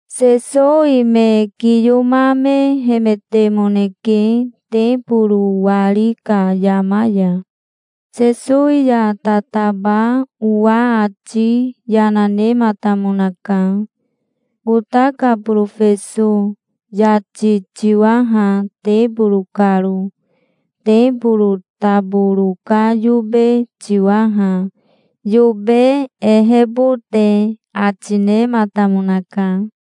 Sesowi me kiyomamehemetemoneke teboro wari ka yama ya. Sesowi ya tataba owa ati yana nematamonaka. "Ota ka borofeso yati tiwa ha teboro karo. Teboro taboro ka yobe tiwa ha, yobe ehebote", ati nematamonaka.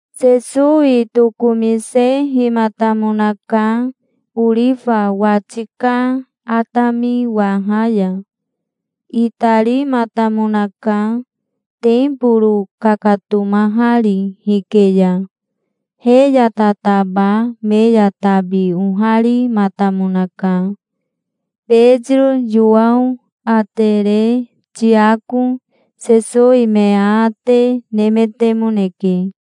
Sesowi tokomisehimatamonaka, orifa wati ka atami waha ya. Itarimatamonaka, teboro kakatomahari hike ya. He ya tataba me ya tabi oharimatamonaka. Betiro, Yowao, Atere, Tiako, Sesowi me aate nemetemoneke.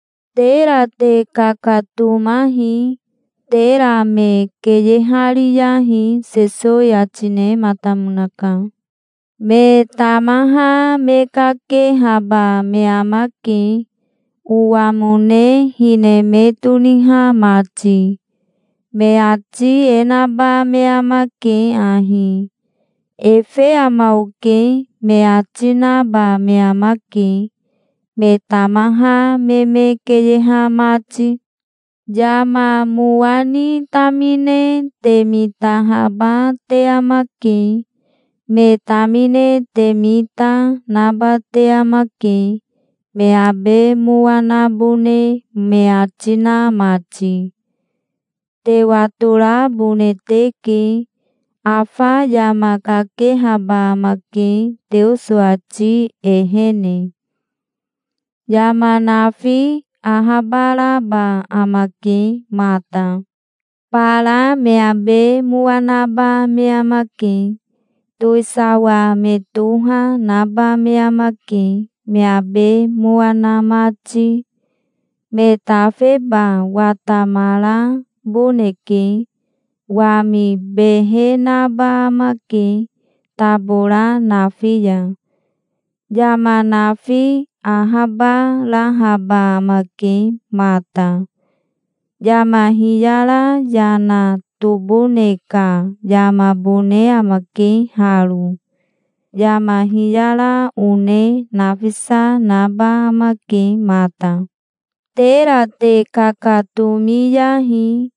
"Tera te kakatomahi. Tera me keyehariyahi", Sesowi ati nematamonaka. "Me tamaha me kakehaba me amake, owamone hine me toniha mati. Me ati e naba me amake ahi: 'Efe ama oke', me ati naba me amake, me tamaha me me keyeha mati. Yama mowa ni tamine te mitahaba te amake. Me tamine te mita, naba te amake, me abe mowa nabone me ati na mati. Te watorabone teke. Afa yama kakehaba amake, Teoso ati ehene. Yama nafi ahabaraba amake mata. Bara me abe mowa naba me amake. Towisawa me toha naba me amake, me abe mowa na mati. Me tafeba watamaraboneke. Wami behe naba amake tabora nafi ya. Yama nafi ahabarahaba amake mata. Yama hiyara yana tobone ka yamabone amake haro. Yama hiyara one nafisa naba amake mata". "Tera te kakatomiyahi.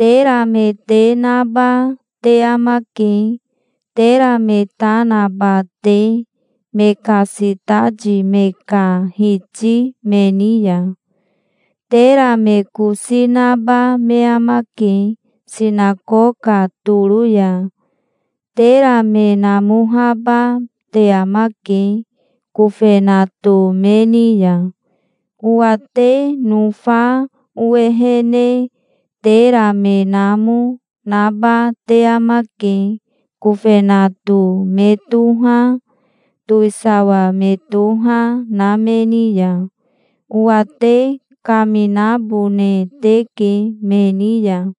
Tera me te naba te amake, tera me ta naba te, me ka sitati me ka hiti me ni ya. Tera me kosi naba me amake sinakoka toro ya. Tera me namohaba te amake kofenato me ni ya, owa te nofa owehene. Tera me namo naba te amake, kofenato me toha, towisawa me toha, na me ni ya. Owa te kaminabone teke me ni ya.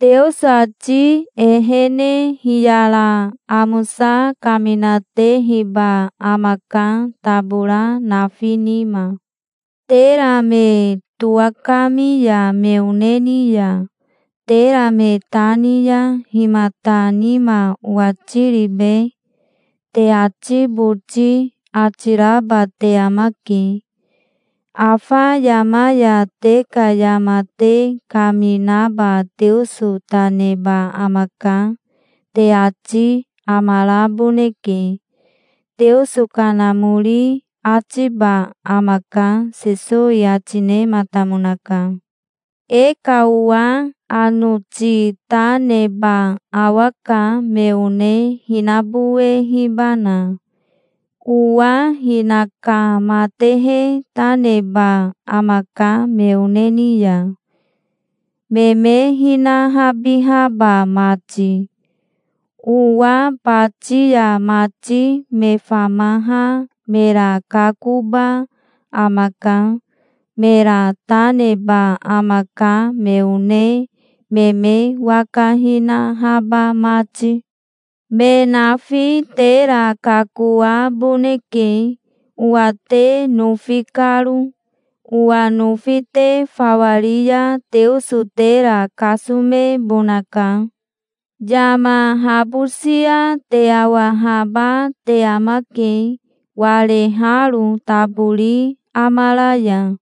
Teoso ati ehene hiyara amosa kaminatehiba amaka tabora nafi nima. Tera me towakami ya me one ni ya tera me ta ni ya, 'Himata nima owati ribe?' te ati boti ati raba te amake. Afa yama ya te ka yama te kaminaba Teoso ta neba amaka. Te ati amaraboneke. Teoso Kanamori atiba amaka", Sesowi ati nematamonaka. "E ka owa anoti ta neba awaka, me one hinabowehibana. Owa hinaka matehe ta neba amaka me one ni ya, me me hinahabihaba mati. Owa bati ya mati me famaha mera kakoba amaka. Mera ta neba amaka, me one me me waka hinahaba mati. Me nafi tera kakoaboneke, owa te nofi karo. Owa nofi te fawa ri ya Teoso tera kasomebonaka. Yama habosia te awahaba te amake, wareharo tabori amara ya".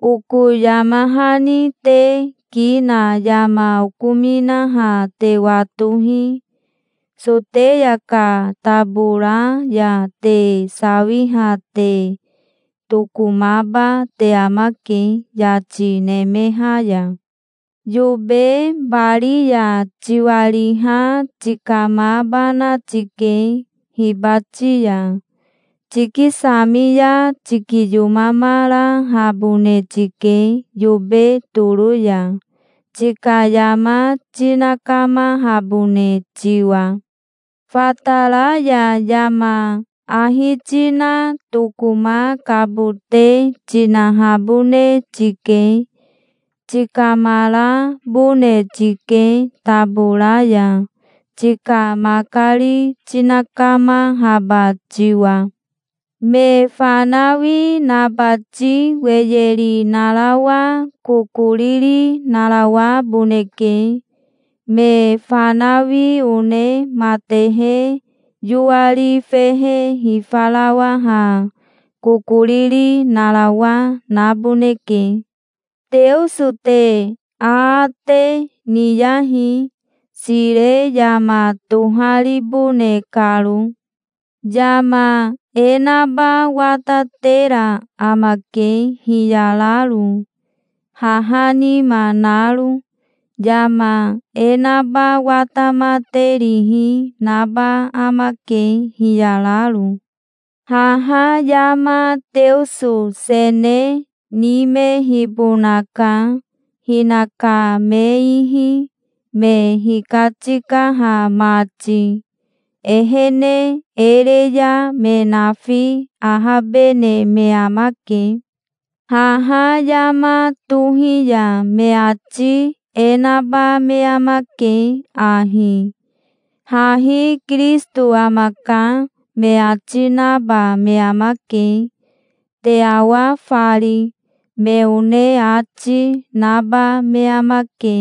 (Oko yama hani te ki na yama okominaha te watohi.) "Soteya ka tabora ya te sawiha te tokomaba te amake yati nemeha ya. Yobe bari ya tiwariha tikamabana tike hibati ya. Tikisami ya tikiyomamarahabone tike yobe toro ya, tika yama tinakamahabone tiwa. Fatara ya yama ahi tina tokomakabote tinahabone tike. Tikamarabone tike tabora ya, tika makari tinakamahaba tiwa. Me fanawi nabati weyeri narawa kokoriri narawaboneke. Me fanawi one matehe yoari fehe hifarawaha kokoriri narawa naboneke. Teoso te aate, niyahi, sire yama toharibone karo. Yama e naba watatera amake, hiyararo, haha nima naro. Yama e naba watamaterihi naba amake, hiyararo. Haha yama Teoso sene nimehibonaka, hinaka me ihi, me hikatikaha mati. Ehene e re ya me nafi ahabene me amake". "Haha yama tohi ya me ati e naba me amake ahi: 'Hahi Kirisito amaka', me ati naba me amake. 'Te awa fari', me one ati, naba me amake.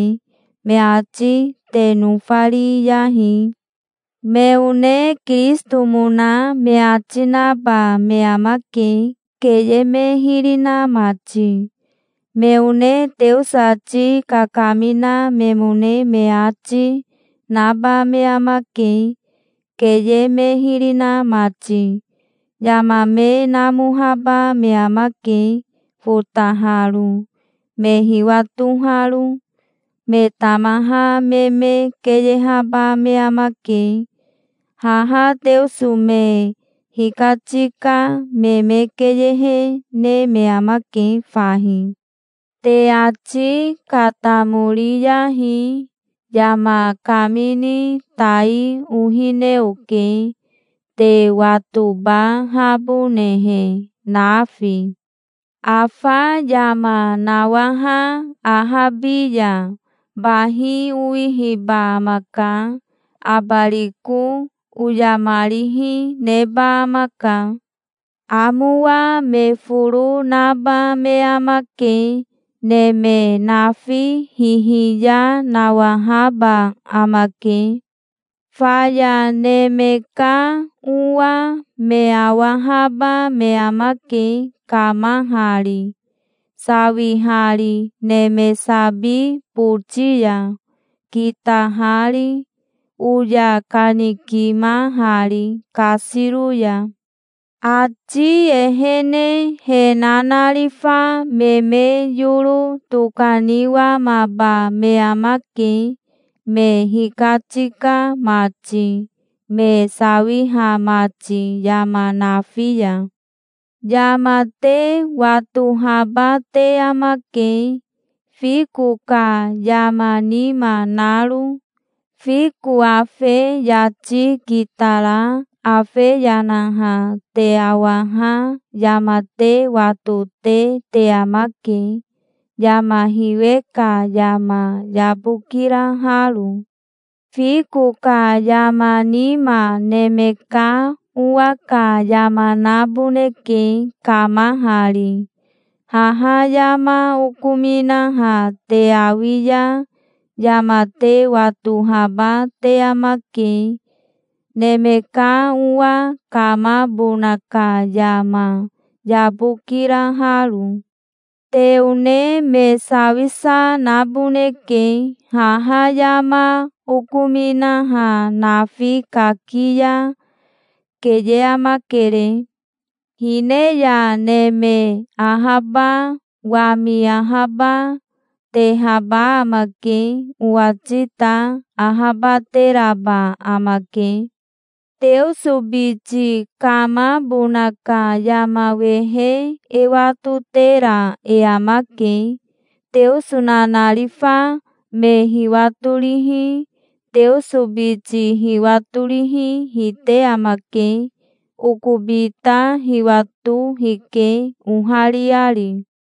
Me ati te nofariyahi. Me one Kirisitomona me ati naba me amake, keye me hiri na mati. Me one Teoso ati kakamina memone me ati, naba me amake, keye me hiri na mati. Yama me namohaba me amake, fotaharo, me hiwatoharo. Me tamaha me me keyehaba me amake. Haha Teoso me hikatika me me keyehene me amake fahi. Te ati katamoriyahi. Yama kamini tai ohine oke, te watobahabonehe, nafi". "Afa yama nawaha ahabi ya bahi owihiba amaka. Abariko oyamarihi neba amaka. Amowa me foro naba me amake. Neme nafi hihiya nawahaba amake. Faya Neme ka Owa me awahaba me amake, kamahari, sawihari neme sabi boti ya, kitahari, oya kanikimahari kasiro ya. Ati ehene he nanarifa me me yoro tokaniwamaba me amake, me hikatika mati, me sawiha mati yama nafi ya". "Yama te watohaba te amake, fiko ka yama nima naro. Fiko afe yati kitara afe yanaha te awaha yama te watote te amake, yama hiwe ka yama, yabokiraharo. Fiko ka yama nima Neme ka Owa ka yama naboneke, kamahari. Haha yama okominaha te awi ya yama te watohaba te amake, Neme ka Owa kamabona ka yama, yabokiraharo. Te one me sawisa naboneke haha yama okominaha nafi kaki ya. Keye amakere. Hine ya neme ahaba, wami ahaba, tehaba amake. Owati ta ahabateraba amake. Teoso biti kamabona ka yama wehe e watotera e amake. Teoso nanarifa me hiwatorihi, Teoso biti hiwatorihi, hite amake. Okobi ta hiwato hike, ohariari".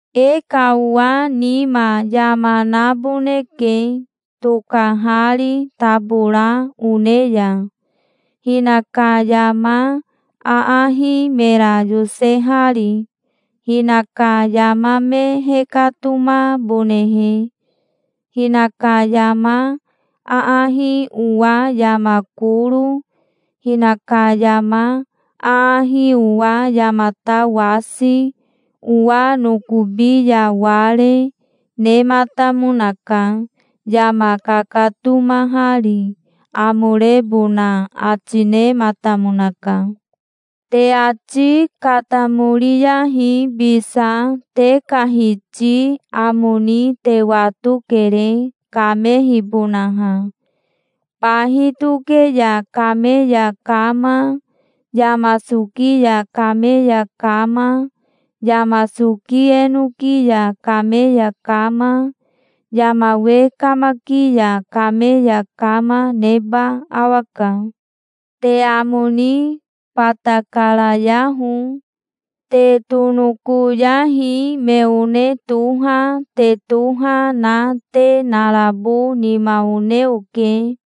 E ka owa nima yama naboneke, tokahari tabora one ya, hinaka yama aahi mera yosehari, hinaka yama me hekatomabonehe. Hinaka yama aahi owa yama koro, hinaka yama aahi owa yamata wasi, owa nokobi ya ware, nematamonaka, yama kakatomahari. Amo rebona ati nematamonaka. Te ati katamoriyahi bisa. Te ka Hiti amo ni te watokere, kamehibonaha. Bahi toke ya kame ya kama, yama soki ya kame ya kama, yama soki enoki ya kame ya kama, yama we kamaki ya kame ya kama, neba awaka. Te amo ni bata karayaho. Te tonokoyahi. Me one toha, te toha, na te narabo nima one oke".